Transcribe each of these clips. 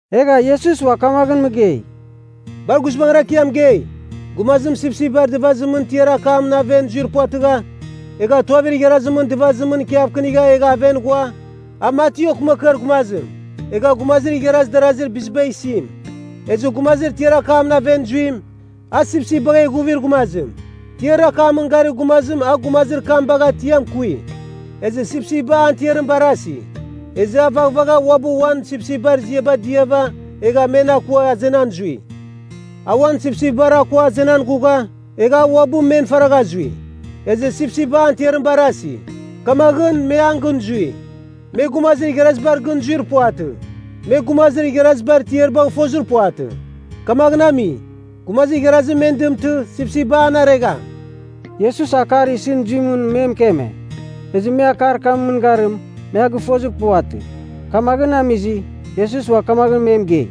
Egha Iesus ua kamaghɨn mɨgei, “Bar guizbangɨra kɨ ia mɨgei, gumazim sipsipbar dɨvazimɨn tiar akamɨn aven zuir puvatɨgha, egha tuavir igharazimɨn dɨvazimɨn ikiavkɨnigha egha aven ghua, a mati okɨmakɨar gumazim egha gumazir igharaz darazir biziba isim. Ezɨ gumazir tiar akamɨn aven zuim, a sipsipbagh eghuvir gumazim. Tiar akamɨn garir gumazim a gumazir kam bagha tiam kui. Ezɨ sipsipba an tiarim barasi. Ezɨ a vaghvagha uabɨ uan sipsipbar ziabar diava egha men akua azenan zui. A uan sipsipbar akua azenan ghugha, egha a uabɨ men faragha zui. Ezɨ sipsipba an tiarim barasi. Kamaghɨn me an gɨn zui. Me gumazir igharazibar gɨn zuir puvatɨ. Me gumazir igharazibar tiaribagh fozir puvatɨ. Kamaghɨn ami, gumazir igharazim men dɨmtɨ, sipsipba an aregham.” Iesus akar isɨn zuimɨn me mɨkeme, ezɨ me akar kamɨn mɨngarim, me a gɨfozir puvatɨ. Kamaghɨn amizɨ, Iesus ua kamaghɨn me mɨgei,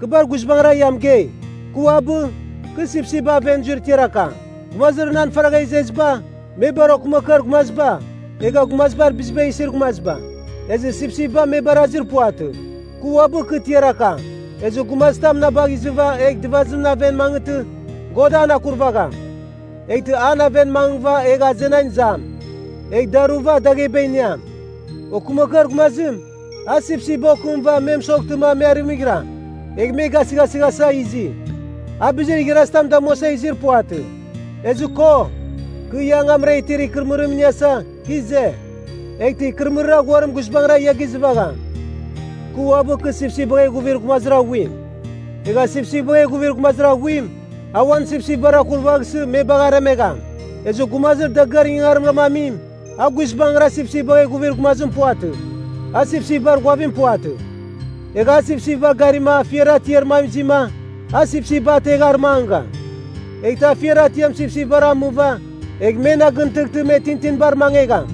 “Kɨ bar guizbangɨra ia mɨgei, kɨ uabɨ, kɨ sipsipba aven zuir tiar akam. Gumazir nan faragha izeziba, me bar okɨmakɨar gumaziba egha gumazibar biziba isir gumaziba. Ezɨ sipsipba me barazir puvatɨ. Kɨ uabɨ kɨ tiar akam. Ezɨ gumazitam na bagh izɨva egh dɨvazimɨn aven mangɨghtɨ, God an akurvagham. Eghtɨ an aven mangɨghɨva egh azenan izam, egh daruva dagheba iniam. “Okɨmakɨar gumazim, a sipsipba okɨmɨva me mɨsoghtɨma me arɨmɨghiram, egh me gasɨghasɨghasa izi. A bizir igharazitam damuasa izir puvatɨ. Ezɨ ko, kɨ ia angamra itir ikɨrɨmɨrim iniasa, kɨ ize, eghtɨ ikɨrɨmɨrir aghuarim guizbangɨra ia gizɨvagham. “Kɨ uabɨ kɨ sipsipbagh eghuvir gumazir aghuim. Egha sipsipbagh eghuvir gumazir aghuim, a uan sipsipbar akurvaghsɨ me bagh aremegham. Ezɨ gumazir dagɨar ingangarimra amim, a guizbangɨra sipsipbagh eghuvir gumazim puvatɨ, a sipsipbar ghuavim puvatɨ. Egha a sipsipbar garima afiar atiar mam izima, a sipsipba ategh arɨmangɨgham. Eghtɨ afiar atiam sipsipbar amɨva egh men agɨntɨghtɨ me tintinibar mangegham.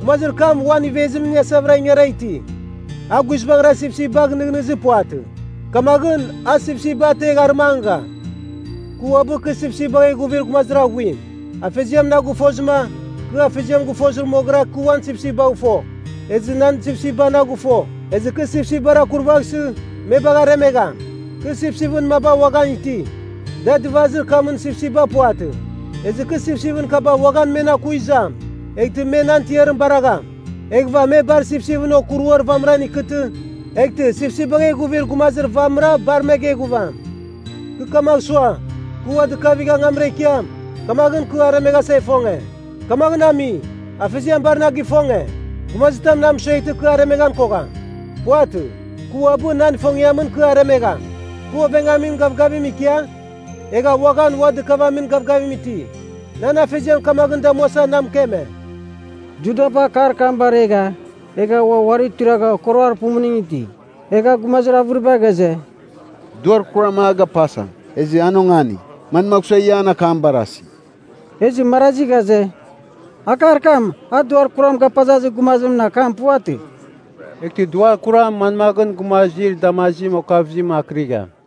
Gumazir kam uan ivezim iniasavɨra ingara iti. A guizbangɨra sipsipbagh nɨghnɨzir puvatɨ. Kamaghɨn, a sipsipba ategh arɨmangɨgham. “Kɨ uabɨ kɨ sipsipbagh eghuvir gumazir aghuim. Afeziam na gɨfozɨma, kɨ Afeziam gɨfozɨ moghɨra kɨ uan sipsipbagh fo, ezɨ nan sipsipba na gɨfo. Ezɨ kɨ sipsipbar akurvaghsɨ, me bagh aremegham. Kɨ sipsipɨn maba uaghan iti, da dɨvazir kamɨn sipsipba puvatɨ. Ezɨ kɨ sipsipɨn kaba uaghan men aku izam, eghtɨ me nan tiarim baragham. Eghɨva me bar sipsipɨn okuruar vamɨra ikɨtɨ, eghtɨ sipsipbagh eghuvir gumazir vamɨra bar me geghuvam. “Kɨ kamagh sua, kɨ ua dɨkavigh angamra ikiam, kamaghɨn kɨ aremeghasa ifonge. Kamaghɨn ami, Afeziam bar na gifonge. Gumazitam na mɨsueghtɨ kɨ aremeghan kogham. Puvatɨ. Kɨ uabɨ nan ifongiamɨn kɨ aremegham. Kɨ oveghamin gavgavim ikia, egha uaghan ua dɨkavamin gavgavim iti. Nan Afeziam kamaghɨn damuasa na mɨkeme.” Judaba akar kam baregha egha ua uari tuiragha okoroar pumuning iti. Egha gumazir avɨriba ghaze, “Duar kuram a gapasa, ezɨ an ongani. Manmagh sua ia an akam barasi?” Ezɨ marazi ghaze, “Akar kam, a duar kuram gapazazir gumazimɨn akam puvatɨ. Eghtɨ duar kuram manmaghɨn gumazir damazim okavɨzim akɨrigham?”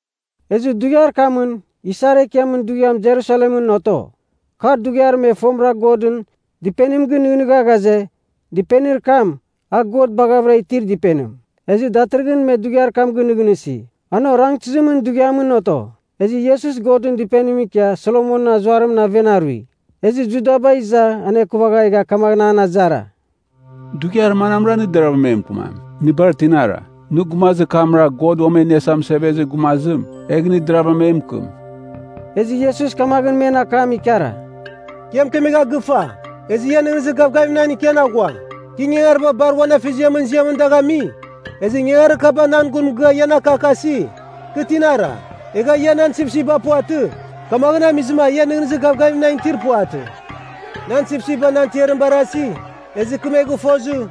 Ezɨ dughiar kamɨn, isar ekiamɨn dughiam Jerusalemɨn oto. Kar dughiar me fomɨra Godɨn Dɨpenim gɨnɨghnɨgha ghaze, dɨpenir kam a God baghavɨra itir dɨpenim. Ezɨ datɨrɨghɨn me dughiar kam ginɨghnɨsi. An orangtɨzimɨn dughiamɨn oto. Ezɨ Iesus Godɨn Dɨpenimɨn ikia Solomonɨn Azuarimɨn aven arui. Ezɨ Judaba iza anekuvagha egha kamaghɨn an azara, “Dughiar manamra nɨ deravɨra e mɨkɨmam, nɨ bar tinara? Nɨ gumazir kamra, God Uam E Iniasa Mɨsevezir Gumazim, egh nɨ deravɨra e mɨkɨm.” Ezɨ Iesus kamaghɨn men akam ikara, “Kɨ ia mɨkemegha gɨfa, ezɨ ia nɨghnɨzir gavgavim nan ikian aghua. Kɨ ingangariba bar uan Afeziamɨn ziamɨn dagh ami, ezɨ ingangarir kaba nan gun mɨgɨa ian akakasi, kɨ tinara. Egha ia nan sipsipba puvatɨ, kamaghɨn amizɨma ia nɨghnɨzir gavgavim nan itir puvatɨ. Nan sipsipba nan tiarim barasi, ezɨ kɨ me gɨfozɨ,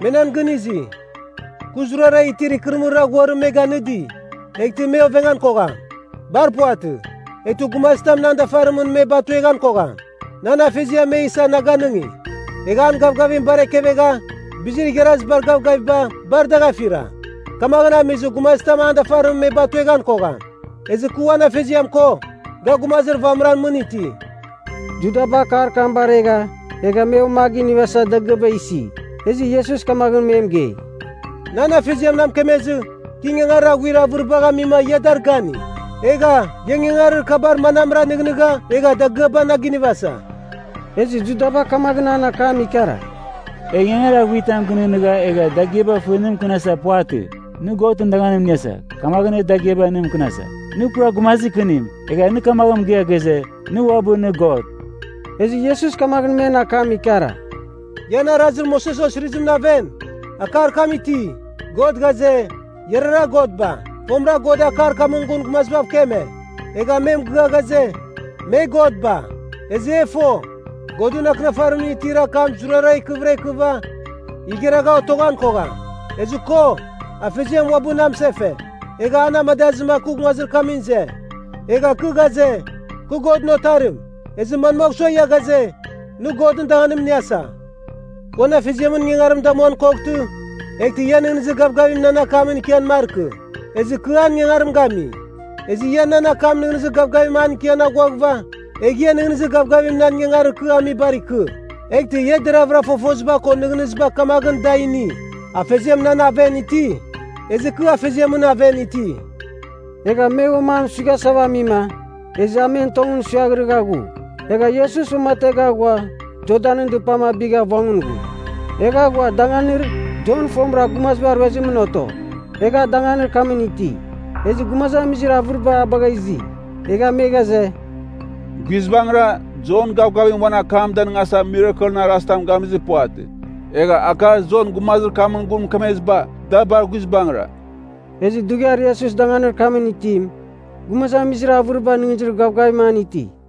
me nan gɨn izi. Kɨ zurara itir ikɨrɨmɨrir aghuarim me ganɨdi, eghtɨ me ovengan kogham. Bar puvatɨ. Eghtɨ gumazitam nan dafarimɨn me batueghan kogham. Nan Afeziam me isa na ganɨngi. Egha an gavgavim bar ekevegha, bizir igharazibar gavgaviba, bar dagh afira. Kamaghɨn amizɨ gumazitam an dafarimɨn me batueghan kogham. Ezɨ kɨ uan Afeziam ko, ga gumazir vamɨran mɨn iti.” Judaba akar kam baregha egha me ua a ginivasa dagɨaba isi. Ezɨ Iesus kamaghɨn me mɨgei, “Nan Afeziam na mɨkemezɨ, kɨ ingangarir aghuir avɨribagh amima ia dar gani. Egha, ia ingangarir kabar manamra nɨghnɨgha egha dagɨaba na ginivasa?” Ezɨ Judaba kamaghɨn an akam ikara, “E ingangarir aghuitam gɨnɨghnɨgha egha dagɨaba fɨ nɨ mɨkɨnasa, puvatɨ. Nɨ Godɨn danganim iniasa, kamaghɨn e dagɨaba nɨ mɨkɨnasa. Nɨ pura gumazir kɨnim, egha nɨ kamaghɨn mɨgɨa ghaze, nɨ uabɨ nɨ God.” Ezɨ Iesus kamaghɨn men akam ikara, “Ian Arazir Moses Osirizimɨn aven, akar kam iti, ‘God ghaze, “Iarara godba.” ’ Fomɨra God akar kamɨn gun gumazibav keme, egha me mɨgɨa ghaze, me godba. Ezɨ e fo, Godɨn Akɨnafarimɨn itir akam zurara ikɨvɨra ikɨva, igharagha otoghan kogham. Ezɨ ko, Afeziam uabɨ na mɨsefe, egha na amadazɨma kɨ nguazimɨn ize. Egha kɨ ghaze, ‘Kɨ Godɨn Otarim,’ ezɨ manmagh sua ia ghaze, ‘Nɨ Godɨn danganim iniasa?’ “Kɨ uan Afeziamɨn ingangarim damuan koghtɨ, eghtɨ ia nɨghnɨzir gavgavim nan akamɨn ikian markɨ. Ezɨ kɨ an ingangarim gami. Ezɨ ia nan akam nɨghnɨzir gavgavim an ikian aghuaghɨva, egh ia nɨghnɨzir gavgavim nan ingangarir kɨ amibar ikɨ. Eghtɨ ia deravɨra fofoziba ko nɨghnɨziba kamaghɨn da ini, Afeziam nan aven iti, ezɨ kɨ Afeziamɨn aven iti.” Egha me uam an suighasava amima, ezɨ a men tongɨn suiaghrɨgha ghu. Egha Iesus uamategha ghua Jordanɨn dɨpam abigha vongɨn ghu. Egha ghua danganir Jon fomɨra gumaziba ruezimɨn oto, egha a danganir kamɨn iti. Ezɨ gumazamizir avɨriba a bagha izi. Egha me ghaze, “Guizbangɨra, Jon gavgavim uan akam danɨngasa mirakelɨn arazitam gamizir puvatɨ. Egha akar Jon gumazir kamɨn gun mɨkemeziba, da bar guizbangɨra.” Ezɨ dughiar Iesus danganir kamɨn itim, gumazamizir avɨriba nɨghnɨzir gavgavim an iti.